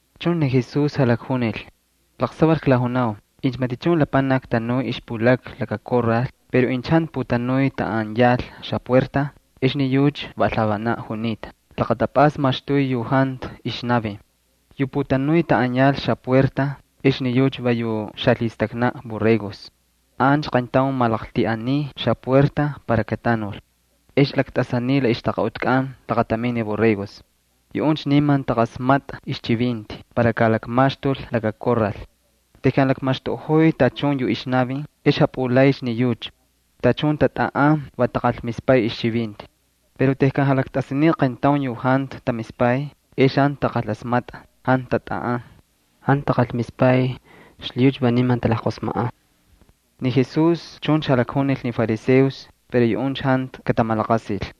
Chuncha ni Jesús jalakjunil: —Laqsaval klajunau incha matichun lapanaki tanuy ixpulakna laka korral pero incha jantu putanuy taꞌan yal xapuerta ex ni yucha va alhavanaꞌ junita, laqatapꞌasta maxtuy yu jantu ixnavin. Yu putanuy taꞌan yal xapuerta ex ni yucha va yu xalhistaknaꞌ borregos. Ancha qayntaun malaqltiꞌaniy xapuerta para katanul. Ex laktꞌasaniy la ixtaqaꞌutkꞌan laqatamin ni borregos. Yuꞌuncha niman taqasmatꞌa ixchivinti para kalakmaxtul laka korral. Tejkan lakmaxtuꞌojoy tachun yu ixnavin ex japꞌulaycha ni yucha. Tachun tatꞌaꞌan, va taqalmispay ixchivinti. Pero tejkan jalaktꞌasaniy aqayntaun yu jantu tamispay, ex jantu taqalasmatꞌa, jantu tatꞌaꞌan. Jantu taqalmispay, xlhiyucha va niman talajqosmajꞌan. Ni Jesús chuncha jalakjunil ni fariseos pero yuꞌuncha jantu katamalaqasil.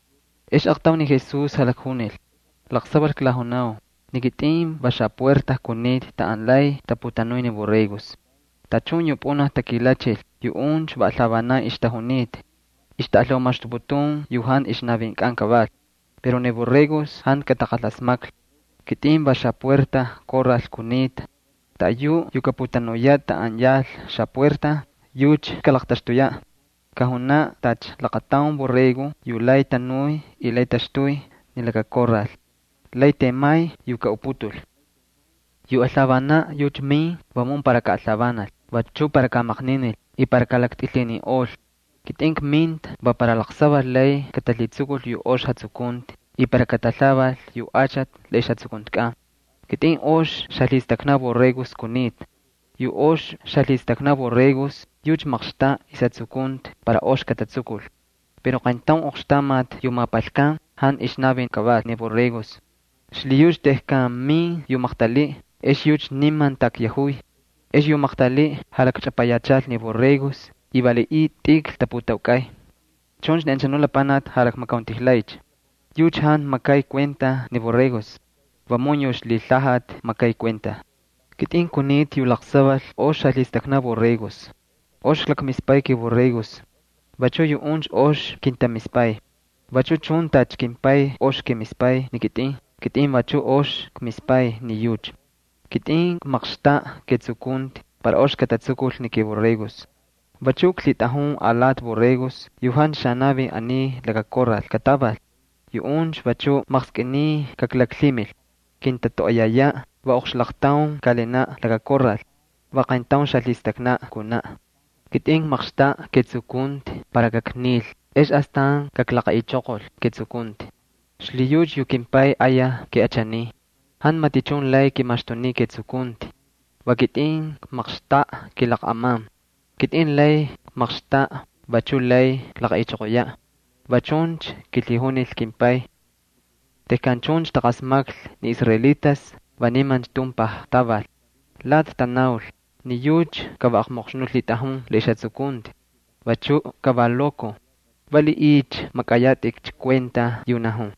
Ex aaqtaun ni Jesús jalakjunil: —Laqsaval klajunau, ni kitꞌin va xapuerta kunita taꞌan lay taputanuy ni borregos. Tachun yu pꞌunaj takilachil, yuꞌuncha va alhavanan ixtajunita. Ixtaꞌalhaumaxtuputun yu jantu ixnavinkꞌan kaval, pero ni borregos jantu kataqalasmaklhi. Ni kitꞌin va xapuerta korral kunita. Taꞌayuꞌ yu kaputanuyaꞌ taꞌan yal xapuerta, yucha kalaqtaxtuyaꞌ. Kajunaꞌ tacha laqataun borrego yu lay tanuy y lay taxtuy ni laka korral, lay temay yu kaꞌuputul. ’Yu alhavanaꞌ yucha min vamun para kaꞌalhavanal, vachu para kamaqninil y para kalaktꞌilhininꞌol. Kitꞌin kminta va para laqsaval lay katalhitsukul yu ox jatsukunti y para katalhaval yu achati la ixjatsukuntikꞌan. Ni kitꞌin ox xalhistaknaꞌ borregos kunita. Yu ox xalhistaknaꞌ borregos, yucha maqxtaꞌa ixjatsukunti para ox katatsukul. Pero qayntaun oqxtamati yu mapalkan jantu ixnavin kaval ni borregos. Xlhiyucha tejkan min yu maqtaliꞌ, ex yucha niman takyajuy. Ex yu maqtaliꞌ jalakchꞌapayachal ni borregos y valiꞌiy tꞌikl taputaukꞌay. Chuncha ni anchanu lapanaki jalakmakauntijlaycha. Yucha jantu makay kuenta ni borregos, vamun yu ixlhilhajati makay kuenta. ’Kitꞌin kunita yu laqsaval ox xalhistaknaꞌ borregos. Ox klakmispay kiborregos, vachu yuꞌuncha ox kintamispay. Vachu chun tacha kimPay ox kimispay ni kitꞌin, kitꞌin vachu ox kmispay ni yucha. Kitꞌin kmaqxtaꞌa ketsukunti para ox katatsukul ni kiborregos. Vachu klhitꞌajun alati borregos yu jantu xanavin aniy laka korral kataval. Yuꞌuncha vachu maqskꞌiniy kaklaklhimil. Kintatoꞌoyayaꞌ, va oqxlaqtaun kaꞌalinaꞌ laka korral. Va qayntaun xalhistaknaꞌ kunaꞌ. ’Kitꞌin kmaqxtaꞌa ketsukunti para kaknil ex astan kaklaqaꞌichoqol ketsukunti. Xlhiyucha yu kimPay ayaj kiꞌachaniy. Jantu matichun lay kimaxtuniy ketsukunti. Va kitꞌin kmaqxtaꞌa kilaqꞌaman. Kitꞌin lay kmaqxtaꞌa, vachuꞌ lay kaklaqaꞌichoqoyaꞌ. Va chuncha kilhijunil kimPay. Tejkan chuncha taqasmaklhi ni israelitas va nimancha tumpaj taval. Lati tanaul: —Ni yucha ka va aqmoqxnuꞌ lhitꞌajun la ixjatsukunti, vachu va lokoj. ¿Valiꞌiycha makꞌayatꞌikcha kuenta yu najun?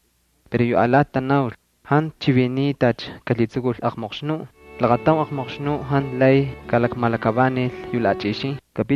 Pero yu alati tanaul: —Jantu chiviniy tacha kalhitsukul aqmoqxnuꞌ. Laqataun aqmoqxnuꞌ jantu lay kalakmalakavanil yu laꞌachꞌixin.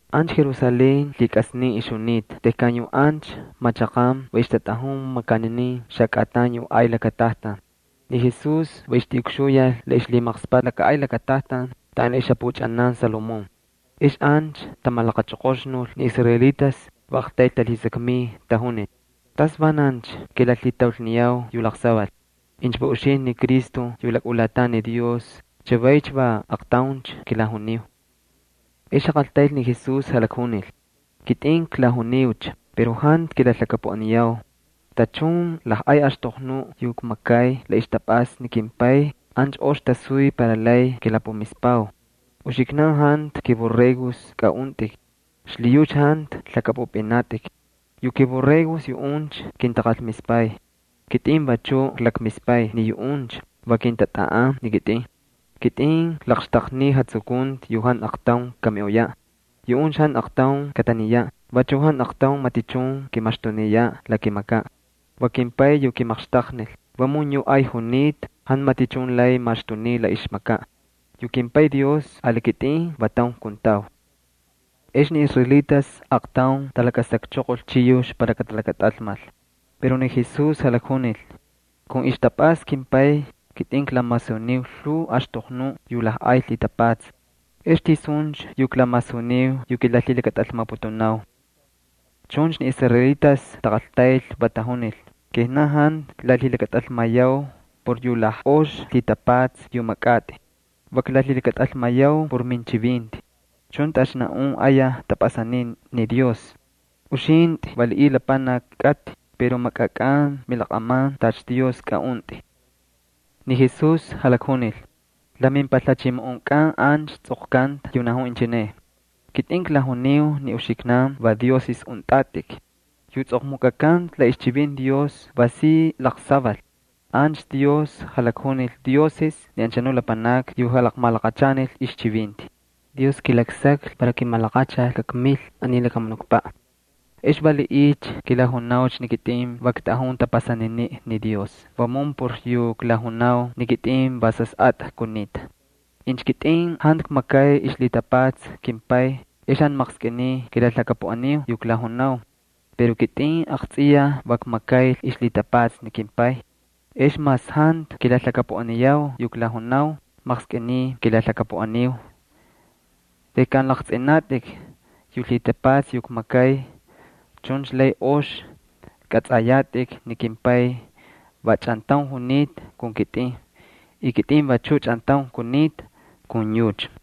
Ancha Jerusalén lhikꞌasnin ixjunita tejkan yu ancha machaqan va ixtatꞌajun makaninin xakꞌatan yu ay lakatajtan. Ni Jesús va ixtijuyal la ixlhimaqspaꞌ laka ay lakatajtan taꞌan ixjapuchꞌanan Salomón. Ex ancha tamalaqachoqoxnul ni israelitas va aqtayl talhisakmiy, va tajunil: —¿Tasvanancha kilalhitaulniyau yu laqsaval? Incha va uxintꞌi ni Cristo yu lakꞌulatan ni Dios chavaycha va aqtauncha kilajuniu. Ex jaqaltayl ni Jesús, jalakjunil: —Kitꞌin klajuniucha pero jantu kilalhakapuꞌaniyau. Tachun lajꞌay axtoqnuꞌ yu kmakay la ixtapꞌasta ni kimPay ancha ox tasuy para lay kilapumispau. Uxiknan jantu kiborregos kꞌaꞌuntꞌik xlhiyucha jantu lhakꞌapꞌupꞌinatꞌik. Yu kiborregos yuꞌuncha kintaqalmispay. Kitꞌin vachuꞌ klakmispay ni yuꞌuncha, va kintatꞌaꞌan ni kitꞌin. Kitꞌin klaqxtaqniy jatsukunti yu jantu aqtaun kamiꞌoyaꞌ. Yuꞌuncha jantu aqtaun kataniyaꞌ, vachu jantu aqtaun matichun kimaxtuniyaꞌ la kimakaꞌ. Va kimPay yu kimaqxtaqnil, vamun yuꞌ ay junita. Jantu matichun lay maxtuniy la ixmakaꞌ. Yu kimPay Dios ali kitꞌin va taun kuntau. Ex ni israelitas aaqtaun talakasakchoqol chiyux para katalakatꞌalmal. Pero ni Jesús jalakjunil: —Kun ixtapꞌasta kimPay kitꞌin klamasuniu lhuu axtoqnuꞌ yu lajꞌay lhitapatsa. ¿Ex tisuncha yu klamasuniu yu kilalhilakatꞌalmaputunau? Chuncha ni israelitas taqaltayl, va tajunil: —Kijnan jantu klalhilakatꞌalmayau por yu lajꞌox lhitapatsa yu makꞌatꞌi. Va klalhilakatꞌalmayau por minchivinti. Chuncha tacha naꞌun ayaj tꞌapꞌasaniy ni Dios. Uxintꞌi valiꞌiy lapanaki kꞌatꞌi pero makꞌakꞌan milaqꞌaman tacha Dios kꞌaꞌuntꞌi. Ni Jesús jalakjunil: —La mimpalhachimoꞌonkꞌan ancha tsꞌoqkanta yu najun inchine: “Kitꞌin klajuniu ni uxiknan va dioses untꞌatꞌik.” Yu tsꞌoqmukꞌakanta la ixchivinti Dios va si laqsaval. Ancha Dios jalakjunil dioses ni anchanu lapanakni yu jalaqmalaqachanil ixchivinti. Dios kilaksaklhi para kimalaqachal kakmil aniy lakamunukpaꞌ. ¿Ex valiꞌiycha kilajunaucha ni kitꞌin va ktꞌajun tapasaniniꞌ ni Dios vamun por yu klajunau ni kitꞌin va Sasꞌatꞌa kunita? Incha kitꞌin jantu kmakay ixlhitapatsa kimPay ex jantu maqskꞌiniy kilalhakapuꞌaniu yu klajunau. Pero kitꞌin aqtsꞌiyaj va kmakay ixlhitapatsa ni kimPay. Ex mas jantu kilalhakapuꞌaniyau yu klajunau, maqskꞌiniy kilalhakapuꞌaniu tejkan laqtsꞌinatꞌik ni lhitapatsa yu kmakay. Chuncha lay ox kꞌatsꞌayatꞌik ni kimPay va chꞌantaun junita kun kitꞌin y kitꞌin vachuꞌ chꞌantaun kunita kun yucha.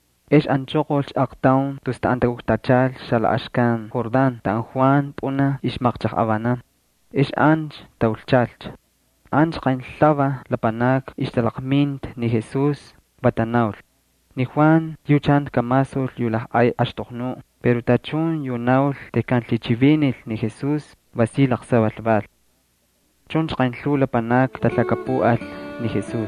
Ex anchoqolcha aaqtaun tus taꞌan takuktachal xalaꞌaxkan Jordán taꞌan Juan pꞌunaj ixmaqchajꞌavanan. Ex ancha taulchalcha. Ancha qaynlhuvaj lapanakni ixtalaqminta ni Jesús, va tanaul: —Ni Juan yucha jantu kamasul yu lajꞌay axtoqnuꞌ, pero tachun yu naul tejkan lhichivinil ni Jesús va si laqsaval val. Chuncha qaynlhuu lapanakni talhakapuꞌal ni Jesús.